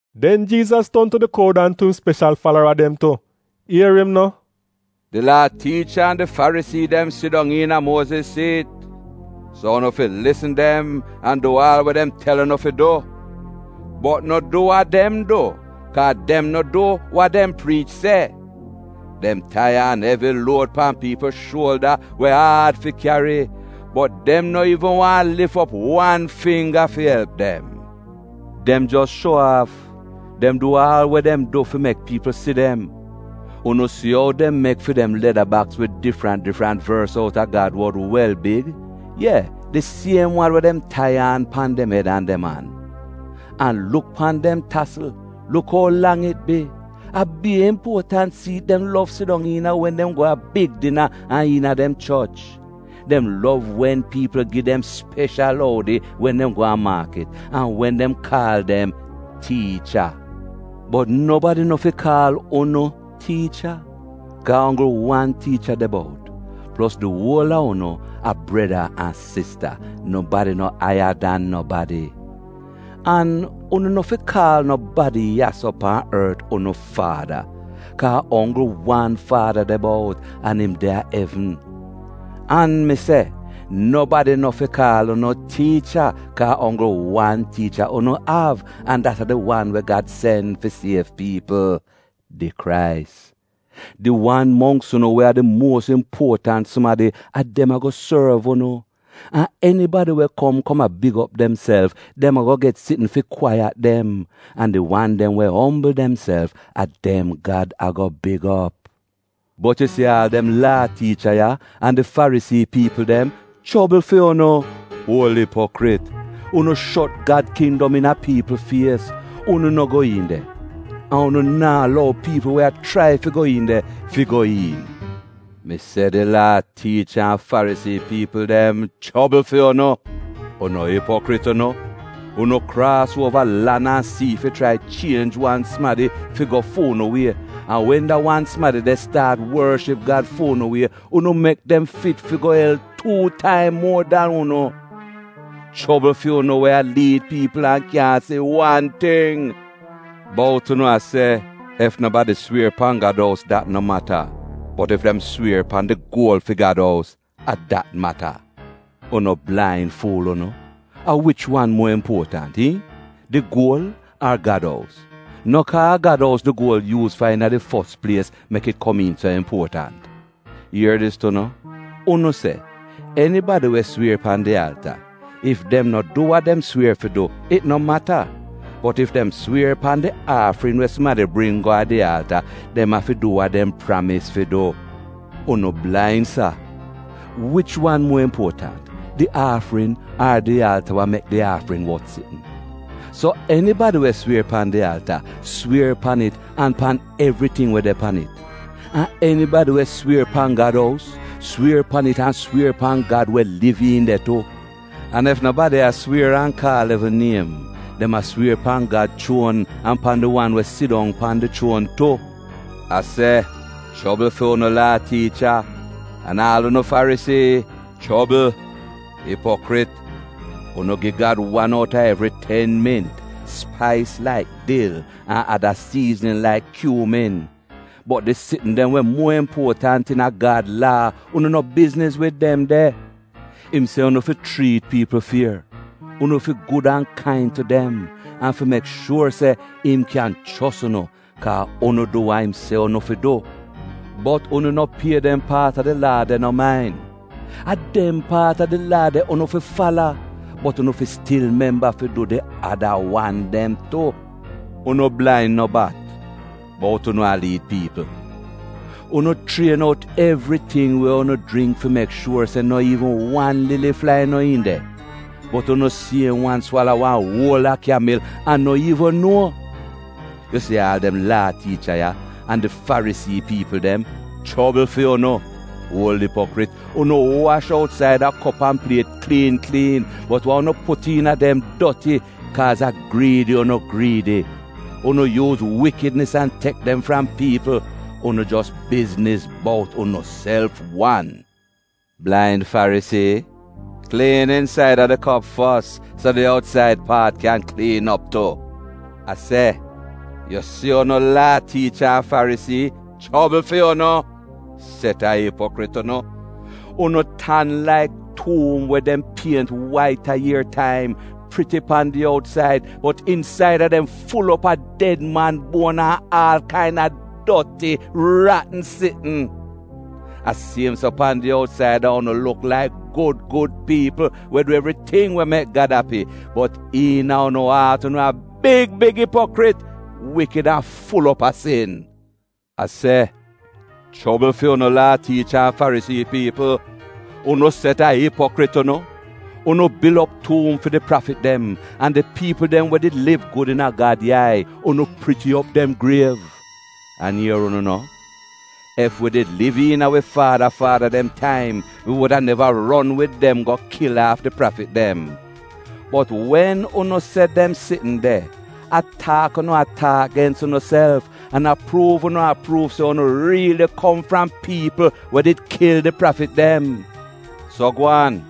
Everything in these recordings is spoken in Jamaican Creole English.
Den Jiizas ton tu di kroud an tu im speshal falara dem tu. Ier im no: “Di Laa tiicha an di Farisii dem sidong iina Muoziz siit. So unu fi lisn dem an du aal we dem tel unu fi du. Bot no du wa dem du, kaa dem no du wa dem priich se. Dem tai aan evi luod pan piipl shuolda we aad fi kyari, bot dem no iivn waahn lif op wan fingga fi elp dem. “Dem jos shuo aaf! Dem du aal we dem du fi mek piipl si dem. Unu si ou dem mek fi dem leda baks wid difrant difrant vors outa Gad wod wel big, ye, di siem wan we dem tai aan pan dem ed an dem an. An luk pan dem tasl, luk ou lang it bi! A bier impuotant siit dem lov sidong iina wen dem go a big dina an iina dem choch. Dem lov wen piipl gi dem speshal oudi wen dem go a maakit, an wen dem kaal dem, ‘Tiicha’. “Bot nobadi no fi kaal unu, ‘tiicha,’ kaa a onggl wan Tiicha de bout, plos di uol a unu a breda an sista; nobadi no aiya dan nobadi. An unu no fi kaal nobadi ya-so pan ort unu ‘faada,’ kaa a onggl wan Faada de bout an im de a evn. An mi se, nobadi no fi kaal unu ‘tiicha,’ kaa a onggl wan Tiicha unu av an dat a di wan we Gad sen fi siev piipl, di Krais. Di wan mongks unu we a di muos impuotant sumadi, a dem ago sorv unu. An enibadi we kom kom a big op demself, dem ago get sitn fi kwaiyat dem. An di wan dem we ombl demself, a dem Gad ago big op. “Bot yu si aal dem Laa tiicha ya an di Farisii piipl dem, chobl fu'unu! Uol ipokrit! Unu shot Gad kindom iina piipl fies! Unu no go iin de, an unu naa lou piipl we a chrai fi go iin de, fi go iin. “Mi se di Laa tiicha an Farisii piipl dem chobl fu'unu! Unu ipokrit unu! Unu kraas uova lan an sii fi chrai chienj wan sumadi fi go fu'unu wie, an wen da wan sumadi de staat worship Gad fu'unu wie, unu mek dem fit fi go el tuu taim muo dan unu! “Chobl fu'unu we a liid piipl an kyaahn si wan ting. Bout unu a se, ‘Ef nobadi swier pan Gad ous dat no mata, bot ef dem swier pan di guol fi Gad ous — a dat mata.’ Unu blain fuul unu! A wich wan muo impuotant, iihn? Di guol? Ar Gad ous? No kaa a Gad ous di guol yuuz fa iina di fos plies mek it komiin so impuotant? Ier dis tu no, unu se, ‘Enibadi we swier pan di alta, ef dem no du wa dem swier fi du, it no mata, bot ef dem swier pan di aafrin we sumadi bring go a di alta dem afi du wa dem pramis fi du.’ Unu blain sa! Wich wan muo impuotant? Di aafrin, ar di alta we mek di aafrin wot sitn? So enibadi we swier pan di alta swier pan it an pan evriting we de pan it. An enibadi we swier pan Gad ous, swier pan it an swier pan Gad we liv iin de tu. An ef nobadi a swier an kaal evn niem, dem a swier pan Gad chuon an pan di wan we sidong pan di chuon tu. “A se chobl fu'unu Laa tiicha, an aal unu Farisii — chobl! Ipokrit! Unu gi Gad wan out a evri ten mint, spais laik dil, an ada siiznin laik kyuumin, bot di sitn dem we muo impuotant iina Gad Laa unu no bizniz wid dem de. Im se unu fi chriit piipl fier, unu fi gud an kain tu dem an fi mek shuor se im kyan chos unu kaa unu du wa im se unu fi du, bot unu no bizniz bout dem paat a di Laa de. A dem paat a di Laa de unu fi fala, bot unu fi stil memba fi du di ada wan dem tu. Unu blain no bat, bout unu a liid piipl! Unu chrien out evriting we unu jringk fi mek shuor se no iivn wan lili flai no iin de, bot unu siem wan swala wan uola kyamil an no iivn nuo! “Yu si aal dem Laa tiicha ya, an di Farisii piipl dem, chobl fu'unu! Uol Ipokrit! Unu wash outsaida kop an pliet kliin kliin, bot wa unu put iina dem doti, kaaz a griidi unu griidi. Unu yuuz wikidnis an tek dem fram piipl. Unu jos bizniz bout unuself wan. Blain Farisii! Kliin insaida di kop fos, so di outsaid paat kyan kliin op tu! “A se, yu si unu Laa tiicha an Farisii — chobl fu'unu! Set a ipokrit unu! Unu tan laik tuum we dem pient wait a ier taim — priti pan di outsaid bot insaida dem ful op a ded man buon an aal kaina doti, ratn sitn. A siem so pan di outsaida unu luk laik gud gud piipl we du evriting we mek Gad api, bot iina unu aat unu a big big ipokrit — wikid an ful op a sin! “A se chobl fu'unu Laa tiicha an Farisii piipl, unu set a ipokrit unu! Unu bil op tuum fi di prafit dem. An di piipl dem we did liv gud iina Gad yai, unu priti op dem griev. An ier unu no, ‘Ef wi did liv iina wi faada faada dem taim wi wuda neva ron wid dem go kil aaf di prafit dem.’ Bot wen unu se dem sitn de, a taak unu taak gens unuself, an a pruuv unu a pruuv se unu riili kom fram piipl we did kil di prafit dem. So gwaan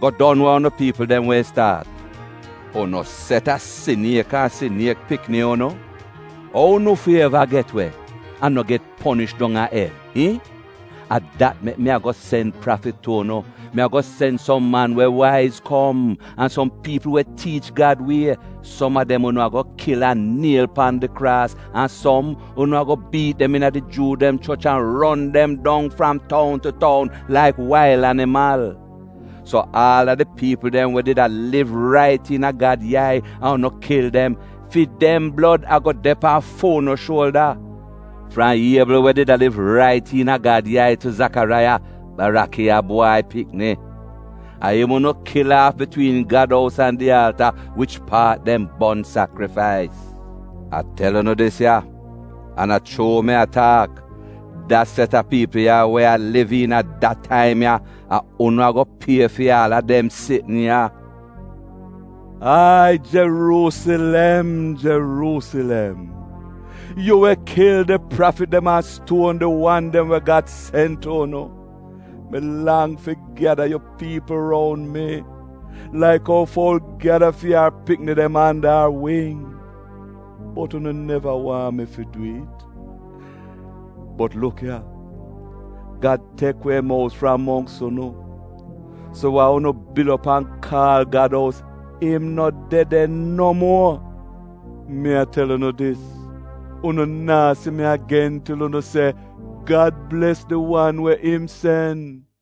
go don wa unu piipl dem wehn staat. “Unu set a siniek an siniek pikni unu! Ou unu fi eva get we, an no get ponish dong a el, iihn? A dat mek mi ago sen prafit tu unu, mi ago sen som man we waiz kom, an som piipl we tiich Gad wie, som a dem unu ago kil an niel pan di kraas, an som, unu ago biit dem iina di Juu dem choch an ron dem dong fram toun tu toun laik wail animal. So aal a di piipl dem we did a liv rait iina Gad yai an unu kil dem, fi dem blod ago de pan fu'unu shuolda. Fram Iebl we did a liv rait iina Gad yai, tu Zakaraiya — Barakiya bwai pikni. A im unu kil aaf bitwiin Gad ous an di alta wich paat dem bon sakrifais. A tel unu dis ya, an a chuu mi a taak, da set a piipl ya, we a liv iina da taim ya, a unu ago pie fi aal a dem sitn ya! “Ai Jeruusilem, Jeruusilem, yu we kil di prafit dem an stuon di wan dem we Gad sen tu unu, mi lang fi gyada yu piipl roun mi, laik ou foul gyada fi ar pikini dem anda ar wing, bot unu neva waahn mi fi dwi'it! Bot luk ya, Gad tek we im ous fram mongks unu. So wa unu bil op an kaal Gad ous, im no de de no muo. Mi a tel unu dis, unu naa si mi agen til unu se, ‘Gad bles di wan we im sen.’”